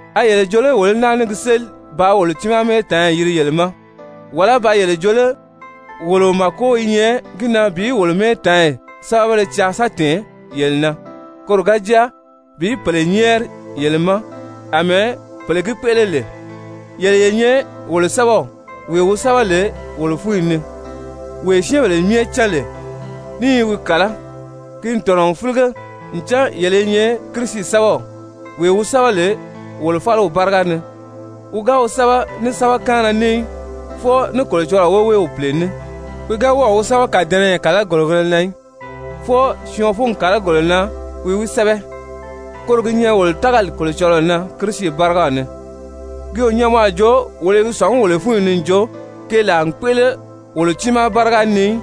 A yele jo lé wolo í náa ní gi séli bàā wolo tiimaa mɛ́ɛtaanyi yiri yele ma? Wàlá ba yele jo lé wolo màko i nyɛ gi na bi wolo mɛ́ɛtaanyi sɛ́bɛbéle caa sa tɛ̀ɛn yele na, koro ga jáa bi pèle nyɛ́ɛri yele ma àmɛɛ pèle gi kpéʔele lè? Yele ye nyɛ wolo sɛ́bɛw wee wi sɛ́bɛ lè wolo fúnyi ni, wee syɛ́ɛnbèle myɛ cán lè, ní i wi kàlá. Ki n tɔ̀nɔ n fílige ncan yele i nyɛ Kirisi sɛ́bɛw, wee wi sɛ́bɛ lè wolo fáliw báriga ni, wi ga wi sɛ́bɛ ní sɛ́bɛkaanna ní í, fwɔɔ ní Kolocɔlɔɔ woweew Pìle ní. Wi ga wɔ́ɔ̀ wi sɛ́bɛ kàdɛnɛyɛ kàlagorigēle na í, fwɔɔ syɔɔn fúngi kàlagolo na wi wi sɛ́bɛ. Koro gi nyɛ wolo tágali Kolocɔlɔɔ na Kirisi bárigaw ni. Ki o nyɛ mɔ a jo wolo i gi sɔ̀ngí wolo fúnyi ni n jo keelaa n kpéʔele wolo tiimaa báriga ni í,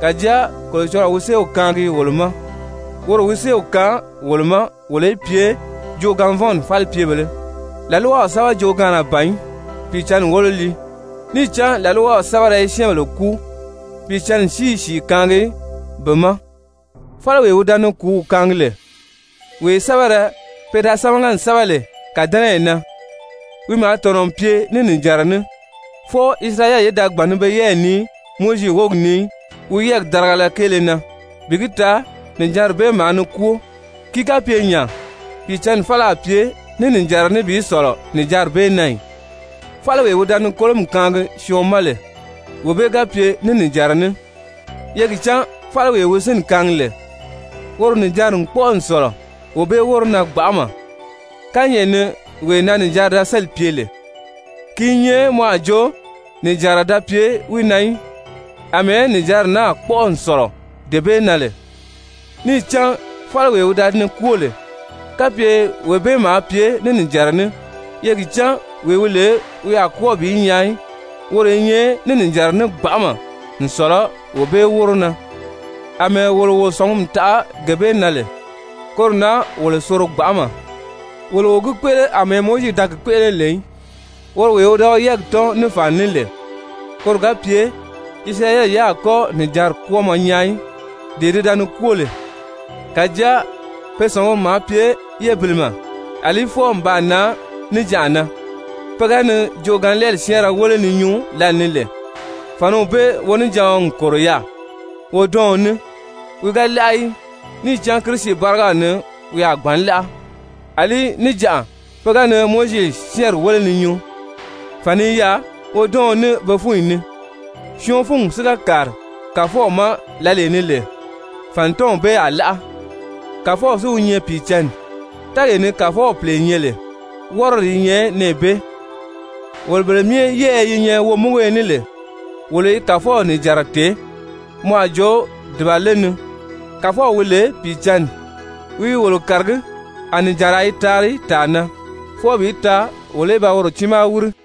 kàjáa Kolocɔlɔɔ wi séew kaangi wolo ma. Woro wi séew kaan wolo ma wolo í pye joogaanvɔnni falipyebèlē, làlwaw sɛ́bɛ joogaanna ban í, Pìicǎnni wólo lii. Níì cán làlwaw sɛ́bɛrɛ i syɛ́ɛnbèle kúu, Pìicǎnni si i sìi kaangi be ma. Fáliwee wi da ni kùúw kaangi lè, wee sɛ́bɛrɛ pe da sámaga n sɛ́bɛ lè kàdɛnɛyi na, wi maa tɔ̀nɔ n pye ní nìjanra ní, fwɔɔ Isirayɛli ye da gbàn ni be yɛ́ɛyi nii Mowizi wógi ni í wi yɛ́ɛgi nìjanra kéele na, bi gi taa nìjanri bee maa ni kwóo, ki ga pye nya Pìicǎnni fáli a pye ní nìjanra ní bi sɔ̀lɔ nìjanri bee na ì? Fáliwee wi da ni kolomi kaangi syɔɔn ma lè, wee bee ga pye ní nìjanra ní, ye gi cán fáliwee wi sínni kaangi lè, woro nìjanri n kpɔ́ʔɔ n sɔ̀lɔ wee bee wóro na gbanʔama. Kányɛʔɛ ni wee na nìjanri da sélì pye lè, ki i nyɛ mɔ a jo nìjanra da pye wi na í, àmɛɛ nìjanri naa kpɔ́ʔɔ n sɔ̀lɔ dee bee na lè. Níì cán fáliwee wi da ni kwóo lè, kapye wee bee maa pye ní nìjanra ní, ye gi cán wee wi lè wi a kwɔ́ɔ bi nyaa í, woro i nyɛ ní nìjanra ní gbanʔama n sɔ̀lɔ wee bee wóro na. Amɛɛ wolo wo sɔ̀ngumi taʔa gee bee na lè, koro na wolo soro gbanʔama. Wolo o gi kpéʔele àmɛɛ Mowizi da gi kpéʔele lè í, woro wee wi da wi yɛ́ɛgi tɔ́n ní fàni ní lè koro ga pye Isirayɛli ye a kɔ́ nìjanri kwɔ́ɔmɔ nyaa í, dee ti da ni kwóo lè. Kàjáa pe sɔ̀nguri maa pye yébilimɛ. Alí nlaa fwɔɔ n baa nan níjanʔa na, pe ga ni joogaanlɛɛli syɛ́ɛnrɛ wéle ni nyuu lǎlee ni lè, fàniw bee wonijaɔn n kòro yaà wodɔɔn ní. Wi ga láʔa í, níì cán Kirisi bárigaw ni wi a gbǎn láʔa. Alí níjanʔa pe ga ni Mowizi syɛ́ɛnri wéle ni nyuu, fàni i yaà wodɔɔn ní be fúnyi na. Syɔɔn fúngi si ga kàri Kàfɔw ma lǎlee ni lè, fànitɔnw bee a láʔa. Kàfɔw si wi nyɛ Pìicǎnni. Tɛ́ɛgee ni Kàfɔw Pìle nyɛ lè, wɔ́rɔdi i nyɛ nɛɛ bee. Wolo bele myɛ yɛ́ɛyɛ yi nyɛ womúguyo ní lè, wolo i Kàfɔw nìjanra tèé mɔ a jo dùbale ni, Kàfɔw wi lè Pìicǎnni, wi i wolo kàragí, a nìjanraa i taari tàa na fwɔɔ bi taa wolo í ba woro tiimaa wíri.